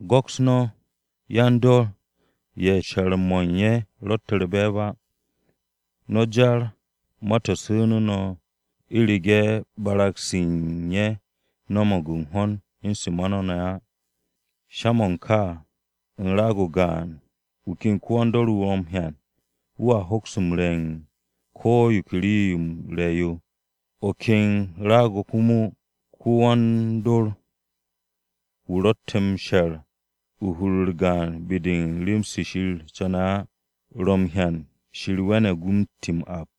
Go̱ks no̱ yan-dor ye̱ she̱r-mo̱ u̱n ye̱ ro̱tte̱ u̱r-be̱e̱b á. No̱ jar ma-to̱ su̱nu̱ no̱ u̱rege̱ barag-se u̱n ye̱ no̱mo̱g u̱n ho̱n u̱n se ma no̱ ne̱ á. Sha-mo̱ ka, u̱n raag-o gaan, wu̱ ken ko-wan-dor-wu̱ ro̱ m-hyan, wu̱a hoks m-re̱ u̱n ko̱ yo ke rii-yo m-re̱ yo. O̱ ken raag-o̱ komo ko-wan-dor-wu̱ ro̱tte̱ m-she̱r u̱n hur-u̱r gaan be-de u̱n rem-se Shir co̱ne̱ á, ro̱ m-hyan Shir we̱ne̱g na m-ti m-ap.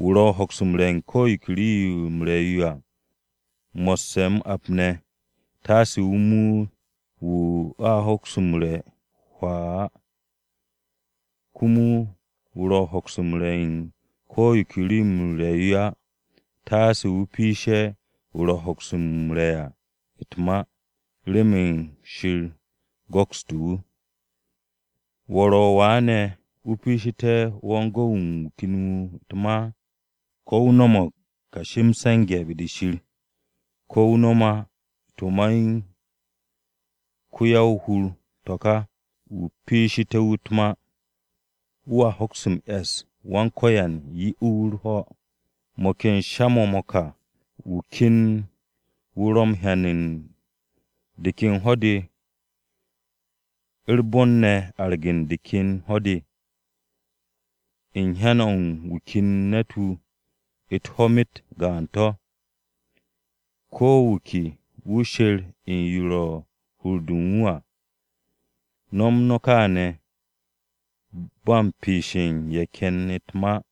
Wu̱ ro̱ m-hoks m-re̱ u̱n ko̱ yo ke rii-yo m-re̱ yo à, mo̱sse̱ m-ap ne̱, taase wu̱ muut wu̱ a hoks m-re̱ á hwaa. Komo wu̱ ro̱ m-hoks m-re̱ u̱n ko̱ yo ke rii-yo m-re̱ yo á, taase wu̱ piishe̱ wu̱ ro̱ m-hoks m-re̱ à u̱t-ma, remen Shir go̱kste̱ wu̱. ¿Wo̱ ro̱ wa ne̱ o piishite̱ wan-gu̱w-mo̱ u̱n wu̱ ken wu̱ u̱t-ma? Ko̱ wu̱ no̱mo̱g kashi m-se̱nge̱ be-de Shir, ko̱ wu̱ no̱m á to̱ ma u̱n ko-ya-o-hur to̱ ka wu̱ piishité̱ wu̱ u̱t-ma. Wu̱a hoks m-e̱s, Wan-Ko̱yan 'ye wu̱ u̱r-ho̱. Mo̱ ken sha-mo̱ mo̱ ka, wu̱ ken wu̱ ro̱ m-hyan u̱n de ken ho̱-de u̱r-bon ne̱ arge̱ de ken ho̱-de. U̱n hyan o̱ u̱n wu̱ ken wu̱ ne̱ u̱t-ho̱ myet gaan to̱. Ko̱ wu̱ ke wu̱ sher u̱n yo ro̱ u̱n hur-de u̱n wu̱ à. No̱m no̱ kaane̱ ba u̱n piishe̱ ye̱ ken u̱t-ma.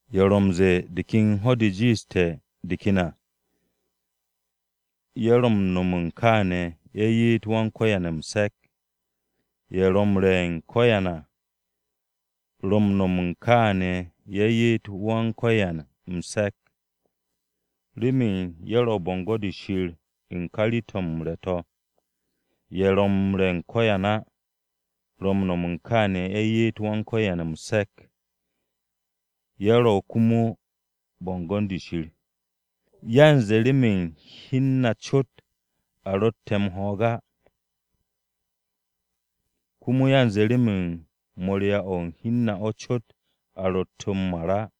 Ye̱ ro̱ m-ze̱e̱ de ken ho̱-de jiishte̱ de ken à, ye̱ ro̱ m-no̱m kaane̱ ye̱ ye'et Wan-Ko̱yan m-se̱k. Ye̱ ro̱ m-re̱ u̱n ko̱yan à, ro̱ m-no̱m kaane̱ ye̱ ye'et Wan-Ko̱yan m-se̱k, remen ye̱ u̱r-bo̱ngo̱n de Shir u̱n ka rii-to̱ m-re̱ to̱. Ye̱ ro̱ m-re̱ u̱n ko̱yan á, ro̱ m-no̱m kaane̱ ye̱ ye'et Wan-Ko̱yan m-se̱k, ye̱ ro̱ komo u̱n bo̱ngo̱n-de Shir. Yanze remen hi u̱n na cot a ro̱tte̱ m-ho̱o̱g á, komo yanze remen morya-o̱ u̱n hi u̱n na cot a ro̱tte̱ m-mar á.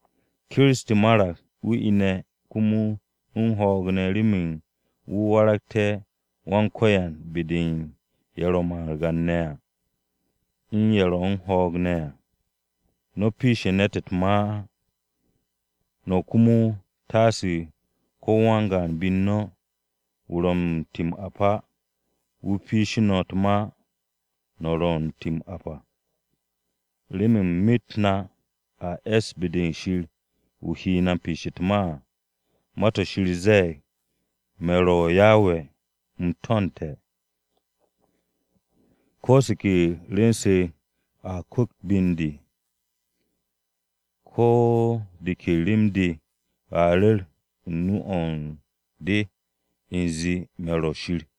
Kiristi marag, wu̱ ine̱ komo u̱n ho̱o̱g ne̱ remen wu̱ waragté̱ Wan-Ko̱yan be-de u̱n ye̱ ro̱ margan-ne̱ à u̱n ye̱ ro̱ u̱n ho̱o̱g ne̱ à. No̱ piishe̱ ne̱t u̱t-ma á. No̱ komo, taase ko̱ wan-gaan be-u̱r no̱, wu̱ ro̱ m-ti m-ap á, wu̱ piishe̱ o̱r u̱n wu̱ u̱t-ma wu̱ ro̱ u̱n ti m-ap à. Remen myet-m na a es be-de Shir wu̱ he na m-piishe̱ u̱t-ma à. Ma-to̱ Shir ze̱e̱g: “Me̱ ro̱ Yawe, u̱m to̱nte̱, ko̱ se ke rwu̱n-se a kwu̱kt be u̱n de, ko̱ de ke rem-de, a ru̱r u̱n nu-o̱ u̱n de u̱nze me̱ ro̱ Shir.”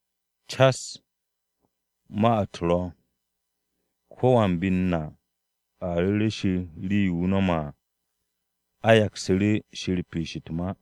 Cas ma-u̱t ro̱, ko̱wan be-u̱r na a ru̱re̱ Shir rii-yo wu̱ no̱me̱ à. A yaksu̱ru̱ Shir piish u̱t-ma.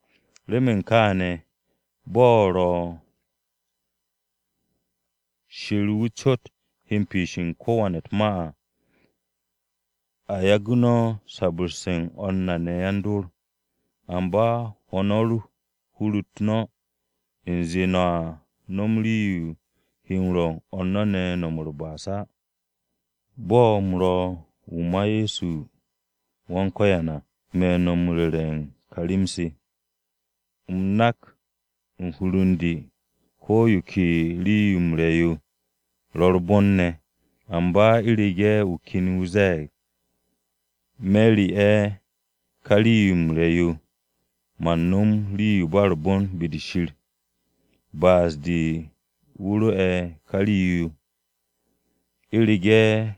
Remen kaane̱, bo̱ ro̱ Shir wu̱ cot, wu̱ he u̱n piishe̱ u̱n ko̱wan u̱t-ma à. A yagu̱ no̱ sabu̱rse̱ u̱n o̱r na ne̱ yan-dor. Amba hwo̱ no̱ hur-u̱t no̱ u̱nze no̱a no̱m rii-yo he rwo̱ u̱n o̱r no̱ ne̱ no̱m u̱r-ba'as á. Bo̱ u̱m ro̱ wu̱ ma Ye̱so Wan-Ko̱yan à, me̱ no̱ m-ru̱re̱ u̱n ka rem-se. U̱m nak u̱n hur u̱n de ko̱ yo ke rii-yo m-re̱ yo, ro̱ u̱r-bon ne̱. Amba u̱rege̱ wu̱ ken wu̱ ze̱e̱g, “Me̱ re'e̱ ka rii-yo m-re̱ yo̱, man no̱m rii-yo ba u̱r-bon be-de Shir.” Ba'as-de wu̱ re'e̱ ka rii-yo. U̱rege̱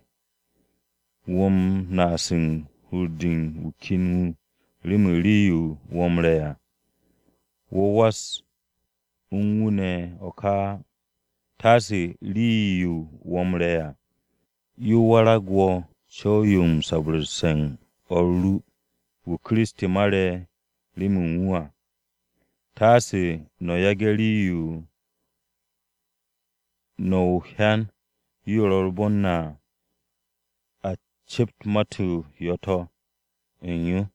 wo̱ u̱n naas u̱n hur-de u̱n wu̱ ken wu̱ remen rii-yo wo̱ m-re̱ à, wo̱ was u̱n wu̱ ne̱ o̱ ka á. Taase rii-yo wo̱ m-re̱ à yo warag wo̱ co̱w-yo u̱n sabu̱rse̱ u̱n o̱r ru, wu̱ Kiristi mare̱ remen u̱n wu̱ à. Taase no̱ yage̱ rii-yo no̱ o-hyan yo u̱r-bon yo à, a cept ma-u̱t yo̱-to̱ to̱ u̱n yo.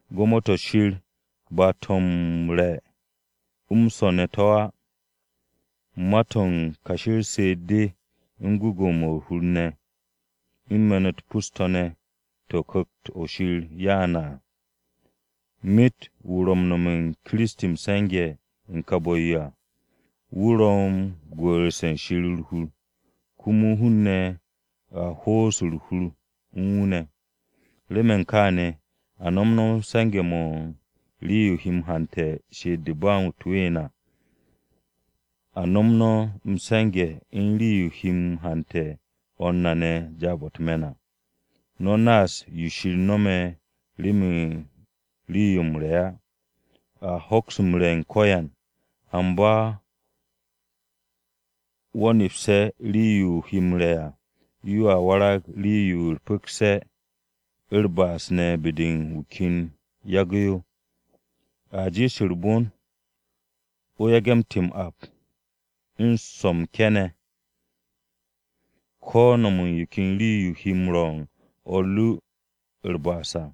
Gwo̱mo-to̱ Shir ba ma-to̱ m-re̱ m-swo̱ ne̱ to̱ á, ma-to̱ u̱n kashi u̱r-she'et de, u̱n gwu̱gwu̱-mo̱ u̱r-hur ne̱, u̱n me̱n-u̱t pus-to̱ ne̱ to̱ Ku̱kt-o̱ Shir ro̱ m-'ya à. Myet wu̱ ro̱ m-no̱me̱ u̱n Kiristi m-se̱nge̱ u̱n ka bu̱-yo à, wu̱ ro̱ m-gwu̱'u̱rse̱ u̱n Shir u̱r-hur, komo hun-ne̱ a ho'os u̱r-hur u̱n wu̱ ne̱. Remen kaane̱, a nom no̱ se̱nge̱-mo̱ u̱n rii-yo he m-hante̱ she'et-de u̱n ba u̱t-ween à. A nom no̱ se̱nge̱-mo̱ u̱n rii-yo he m-hante̱ o̱r na ne̱ jaab-o̱ u̱t-me̱n à. No̱ naas yo Shir no̱me̱ remen rii-yo m-re̱ á. A hoks m-re̱ u̱n ko̱yan, amba wo̱ nepse̱ rii-yo o he m-re̱ à, yoa warag rii-yo u̱r-pu̱kse̱ u̱r-ba'as ne̱ be-de u̱n wu̱ ken yagu̱ yo. A jiish u̱r-bon wo̱ yage̱ ti m-ap, u̱n swo̱ m-ke̱ ne̱, ko̱ no̱m u̱n yo ken rii-yo yo he m-rwo̱ u̱n o̱r ru u̱r-ba'as à.